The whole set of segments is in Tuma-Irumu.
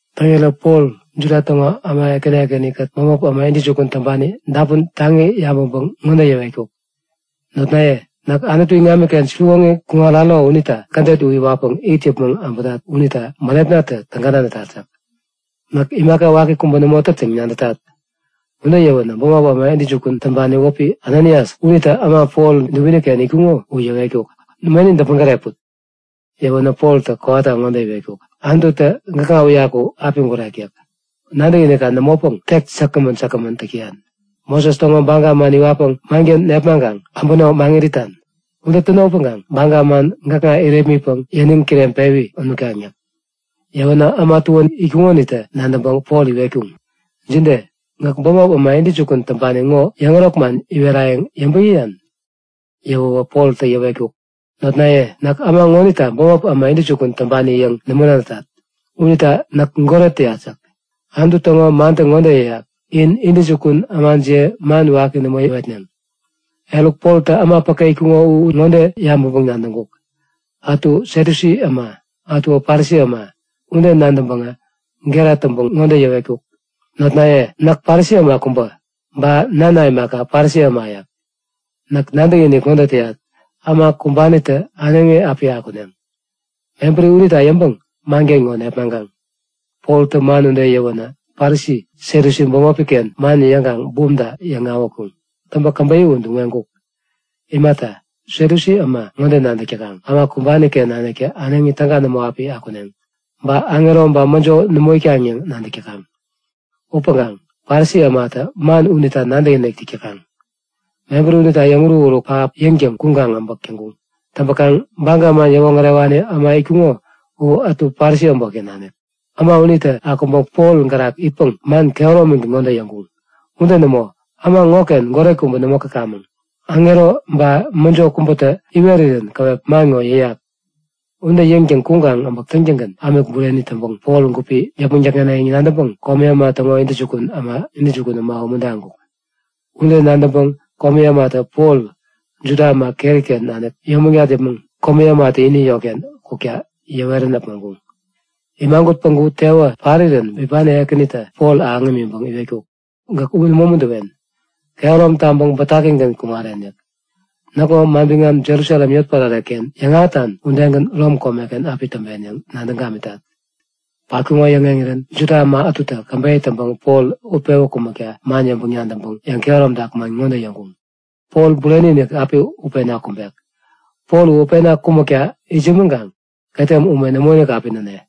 Täŋirä Pol Juda täŋo äma ekäni ekäni-kät bämop äma intäjukun täŋpani dapun taŋi yabäŋpäŋ ŋode yäwetkuk; Notnaye! Näk Anutu iŋamiken siwoŋi kuŋararo unita kädet u iwatpäŋ it yäpmäŋ abätat ŋonita bänepnatä täga nadätat yäk. Näk imaka waki kubä nämo tät yäŋ nadätat yäk. Ude yäwänä bämop äma intäjukun täŋpani wäpi Ananias unitä äma Pol dubini-ken itkuŋo u yäwetkuk; Meni däpmäŋ gäreput! Yäwänä Poltä kowata ŋode iwetkuk; Anututä gäkŋa uyaku api gurek yäk. Nadäkinikka nämopäŋ tek säkgämän säkgämän täk täyan! Moses täŋo baga man iwatpäŋ manken nepmaŋkaŋ äbäno maŋit itan? Ude täno upäŋkaŋ baga man gäkŋa irepmitpäŋ yäniŋ kireŋpewi nutkaŋ yäk. Yäwänä äma tuän itkuŋonitä nadäŋpäŋ Pol iwetkuŋ; Jide? Gäk bämop äma intäjukun täŋpani ŋo yäŋärok man iwerayäŋ yäŋpäŋ yäyan? Yäwäwä Poltä yäwetkuk; Notnaye, näk äma ŋonita bämop äma intäjukun täŋpani yäŋ nämo nadätat. Unita näk goret yät yäk. Anutu täŋo mantä ŋode yäyak; In intäjukun ämajiye man waki nämo yäwetneŋ. Eruk, Poltä äma päke itkuŋo u ŋode yabäŋpäŋ-nadäŋkuk; Ätu Satyusi äma, ätuwä Parisi äma. Ude nadäŋpäŋä gera täŋpäŋ ŋode yäwetkuk; Notnaye, näk Parisi äma kubä. Ba nana imaka, Parisi äma yäk. Näk nadäkinik ŋode täyat; Äma kumbanitä äneŋi api akuneŋ. Mebäri unita yäŋpäŋ manken ŋo nepmaŋkaŋ. Poltä man ude yäwänä Parisi Satyusi bämopi-ken man yäŋkaŋ bumta yäŋ-awätkuŋ. Täŋpäŋ käbeyä u duŋ-weŋkuk. Imata, Satyusi äma ŋode nadäk täkaŋ; Äma kumbani-ken naniktä äneŋi täga nämo api akuneŋ. Ba aŋero ba mäjo nämo itkaŋ yäŋ nadäk täkaŋ. Upäŋkaŋ Parisi ämatä man unita nadäkinik täk täkaŋ. Mebäri unita yäŋuruk-uruk pähap yäŋtäŋ kuŋkaŋ abäk täŋkuŋ. Täŋpäkaŋ Baga man yäwoŋärewani äma itkuŋo u ätu Parisi äbotken nanik. Äma unitä akuŋpäŋ Pol gärak itpäŋ man kehäromigän ŋode yäŋkuŋ; Ude nämo! Äma ŋoken goret kubä nämo käkamäŋ. Aŋero ba mäjo kubätä iwerirän käwep man ŋo yäyak! Ude yäŋtäŋ kuŋkaŋ äbäk täŋtäŋgän ämik bureni täŋpäŋ Pol gupi yäpmäŋ däkŋeneŋ yäŋ nadäŋpäŋ komi äma täŋo intäjukun äma u umuntaŋkuk. Ude nadäŋpäŋ komi ämatä Pol Juda äma keri-ken nanik yomägat yäpmäŋ komi ämatä ini yotken kukta yäwerän äpmoŋkuŋ. Imagut päŋku tewä parirän bipani Ekänitä Pol ahäŋ imiŋpäŋ iwetkuk; Gäk nämo umuntäwen! Kehärom taŋpäŋ bätakigän kuŋaren yäk. Näkŋo manbiŋam Jerusalem yotpärare-ken yäŋahätan udegän Rom komeken api täŋpen yäŋ nadäŋ gamitat. Patkuŋo yäŋeŋirän Juda äma ätutä käbeyä täŋpäŋ Pol utpewä kumäkta man yäŋpäŋ-nadäŋpäŋ yäŋkehäromtak man ŋode yäŋkuŋ; Pol bureni-inik api utpena kumbek. Pol utpena kumäkta itsämäŋkaŋ ketem ume nämoinik api näne.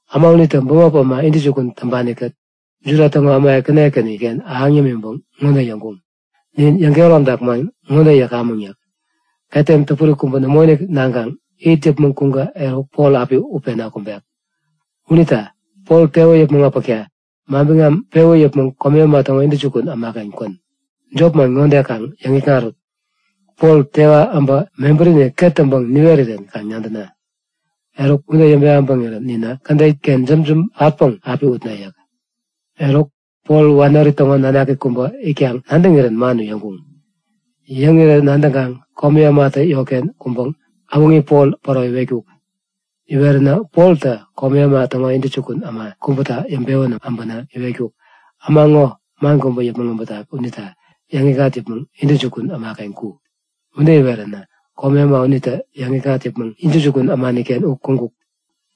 Äma unitä bämop äma intäjukun täŋpani-kät Juda täŋo äma ekäni ekäniken ahäŋ yämiŋpäŋ ŋode yäŋkuŋ; Nin yäŋkehäromtak man ŋode yäkamäŋ yäk. Ketem täpuri kubä nämoinik naŋkaŋ it yäpmäŋ kuŋkä eruk, Pol api utpena kumbek. Unita inä Pol tewä yäpmäŋ äpäkta manbiŋam pewä yäpmäŋ komi äma täŋo intäjukun ämaken kwän. Jop man ŋode kaŋ yäŋikŋarut; Pol tewä äbä mebärini ket täŋpäŋ niwerirän kaŋ nadäna. Eruk ude yäŋpewä äbäŋirän, ninä kädet-ken jämjäm patpäŋ api utne yäk. Eruk, Pol wanori täŋo nanak kubä itkaŋ nadäŋirän man u yäŋkuŋ. Yäŋirä nadäŋkaŋ komi ämatä yotken kuŋpäŋ äwäŋi Pol päro iwetkuk; Iweränä Poltä komi äma täŋo intäjukun äma kubäta yäŋpewän äbänä iwetkuk; Äma ŋo man kubä yäpmäŋ äbätak unita yäŋikŋat yäpmäŋ intäjukun ämaken ku. Ude iweränä komi äma unitä yäŋikŋat yäpmäŋ intäjukun ämaniken u kuŋkuk.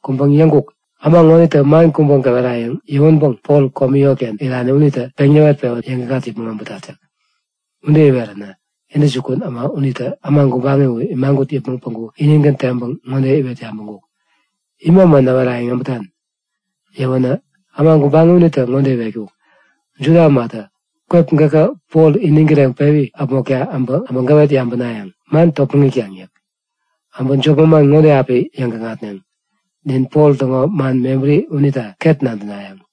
Kuŋpäŋ yäŋkuk; Äma ŋonitä man kubä gäwerayäŋ yäwänpäŋ Pol komi yotken irani unitä peŋ näwet-pewän yäŋikŋat yäpmäŋ äbätat yäk. Ude iweränä intäjukun äma unitä äma gubaŋi u imagut yäpmäŋ päŋku inigän teŋpäŋ ŋode iwet yabäŋkuk; Ima man näwerayäŋ äbätan? Yäwänä äma gubaŋi unitä ŋode iwetkuk; Juda ämatä kwep gäkä Pol iniŋ kireŋpewi äpmokta äbä gäwet yabänayäŋ. Man topmäŋ itkaŋ yäk. Äbä jop manman ŋode api yäŋgäkŋatneŋ; Nin Pol täŋo man mebäri unita ket nadänayäŋ.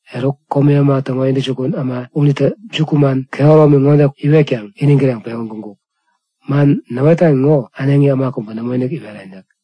Eruk, komi äma täŋo intäjukun äma unitä jukuman kehäromi ŋode iwetkaŋ iniŋ kireŋpewän kuŋkuk; Man näwetan ŋo äneŋi äma kubä nämoinik iweren yäk.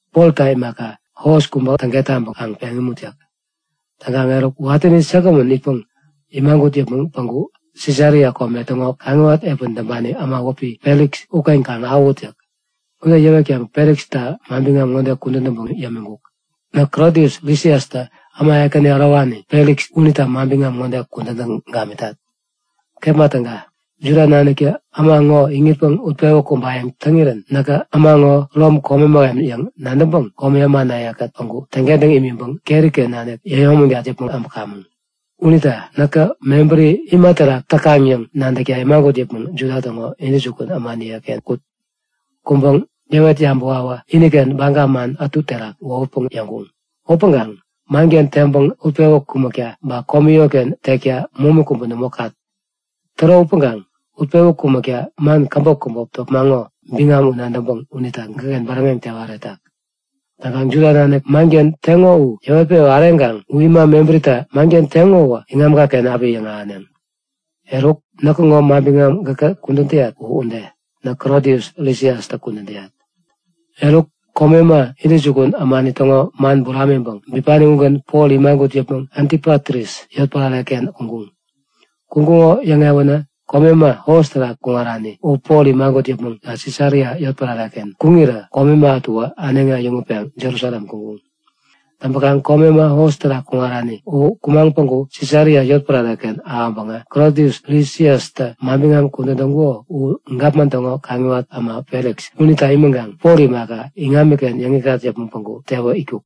Polta imaka, hos kubä täŋket taŋpäŋ kaŋ peŋ imut yäk. Täŋkaŋ eruk, watäni säkgämän itpäŋ imagut yäpmäŋ päŋku Sisaria kome täŋo kaŋiwat epän täŋpani äma wäpi Feliks uken kaŋ ahäwut yäk. Ude yäwetkaŋ Feliksta manbiŋam ŋode kudän täŋpäŋ yämiŋkuk; Näk Klodius Lisiastä äma ekäni ärowani Feliks unita manbiŋam ŋode kudän täŋ gamitat. Kepma täga. Juda naniktä äma ŋo iŋitpäŋ utpewä kumbayäŋ täŋirän näkä äma ŋo Rom kome mähem yäŋ nadäŋpäŋ komi ämanaye-kät päŋku täŋkentäŋ imiŋpäŋ keri-ken nanik yäyomägat yäpmäŋ äbämäŋ. Unita näkä mebäri ima terak täkaŋ yäŋ nadäkta imagut yäpmäŋ Juda täŋo intäjukun ämaniyeken kut. Kuŋpäŋ yäwet yabäwawä iniken baga man ätu terak wohutpäŋ yäŋkuŋ. Upäŋkaŋ manken teŋpäŋ utpewä kumäkta ba komi yotken tekta momi kubä nämo kat. Täro upäŋkaŋ utpewä kumäkta man käbop käbop topmaŋo biŋam u nadäŋpäŋ unita gäkken bäräŋeŋ tewa äretak. Täŋkaŋ Juda nanik manken teŋo u yäwetpewa äreŋkaŋ u ima mebärita manken teŋo iŋamka-ken api yäŋahäneŋ. Eruk, näkŋo manbiŋam gäka kudän täyat u ude. Näk Klodius Lisiastä kudän täyat. Eruk komi äma, intäjukun ämani täŋo man buramiŋpäŋ bipani ugän Pol imagut yäpmäŋ Antipatris yotpärare-ken kuŋkuŋ. Kuŋkuŋo yäŋewänä komi äma hos terak kuŋarani u Pol imagut yäpmäŋ Sisaria yotpärare-ken kuŋirä komi äma ätuwä äneŋi äyäŋutpeŋ Jerusalem kuŋkuŋ. Täŋpäkaŋ komi äma hos terak kuŋarani u kumaŋ päŋku Sisaria yotpärare-ken ahäŋpäŋä Klodius Lisiastä manbiŋam kudän täŋkuko u gapman täŋo kaŋiwat äma Feliks unita imiŋkaŋ Pol imaka, iŋamiken yäŋikŋat yäpmäŋ päŋku tewä itkuk.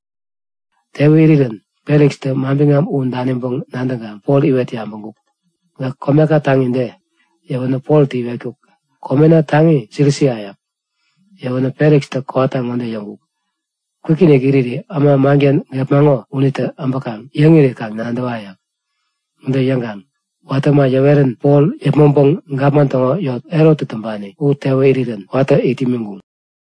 Tewä irirän Felikstä manbiŋam u daniŋpäŋ nadäŋkaŋ Pol iwet yabäŋkuk; Gäk komeka taŋi de? Yäwänä Poltä iwetkuk; Komena taŋi Silisia yäk. Yäwänä Felikstä kowata ŋode yäŋkuk; Kwikinik iriri äma manken gepmaŋo unitä äbäkaŋ yäŋiri kaŋ nadäwa yäk. Ude yäŋkaŋ watä äma yäwerän Pol yäpmäŋpäŋ gapman täŋo yot, Herottä täŋpani, u tewä irirän watä it imiŋkuŋ.